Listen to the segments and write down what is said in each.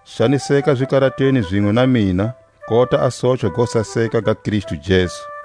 Xaniseka zikaratweni zinwe na mina, kota a sochwa go saseka ga Kristu Jesu.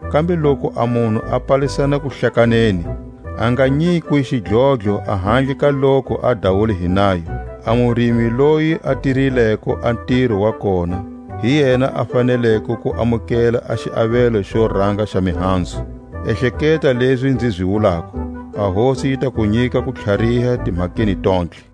Kambe loku a munhu a palisana kuhlakaneni, a nga nyikwi xidlodlo ahandle ka loku a dawule hi nayo. A murimi loyi a tirileko a ntiro wa kona, hi yena a faneleko ku amukela a xiavelo xo ranga xa mihanzu. Ehleketa lezi nzi zi wulako, a Hosi yi ta ku nyika kutlhariha timhakeni tontlhe.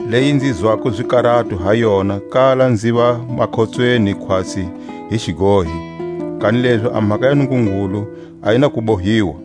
Leyi nzi zwako zikarato ha yona kala nziva makhotsweni khwatsi hi xigohi; kanilezi a mhaka ya Nungungulu a yi na ku bohiwa.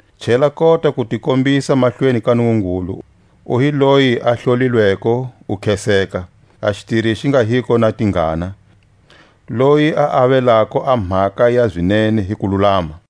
Chela kota ku ti kombisa mahlweni ka Nungungulu u hi loyi a hlolilweko u kheseka, a xitiri xi nga luko na tingana, loyi a avelako a mhaka ya zinene hi kululama.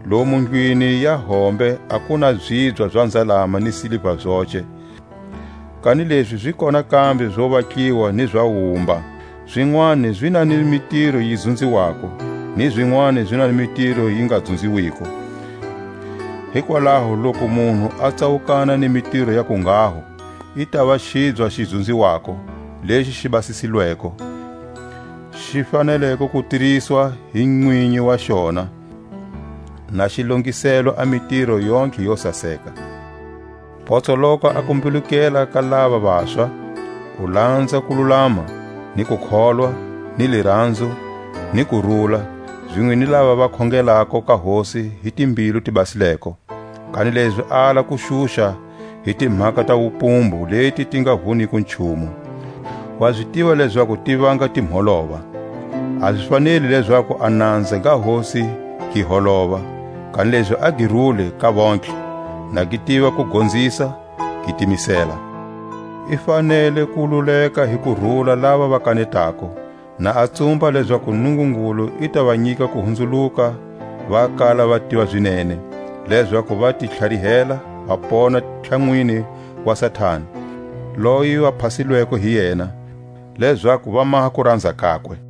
Lomu ndlwini ya hombe a ku na zibya za nzalama ni siliva zoce, kanilezi zi kona kambe zo vatliwa ni za wumba; zinwani zi na ni mitiro yi dzunziwako, ni zinwani zi na ni mitiro yi nga dzunziwiko. Hikwalaho loku munhu a tsawukana ni mitiro ya kunghaho, i tava xibya xi dzunziwako, lexi xi basisilweko, xi faneleko ku tiriswa hi nwinyi wa xona, na xi longiselelwe a mitiro yontlhe yo saseka. Potsoloka a kumbilukela ka lava vaswa, u lanza kululama, ni kukholwa, ni liranzo, ni kurula, zinwe ni lava va khongelako ka Hosi hi timbilu ti basileko. Kanilezi ala ku xuxa hi timhaka ta wupumbu leti ti nga vuniko nchumu; wa zi tiva lezaku ti vanga timholova. A zi faneli lezaku a nanza ga Hosi gi holova, kanilezi a gi rule ka vontlhe, na gi tiva ku gonzisa, gi timisela. I fanele ku luleka hi kurula lava va kanetako, na a tsumba lezaku Nungungulu i ta va nyika kuhunzuluka va kala va tiva zinene, lezaku va ti tlharihela va pona tlhanwini wa Satani, loyi va phasilweko hi yena, lezaku va maha kuranza kakwe.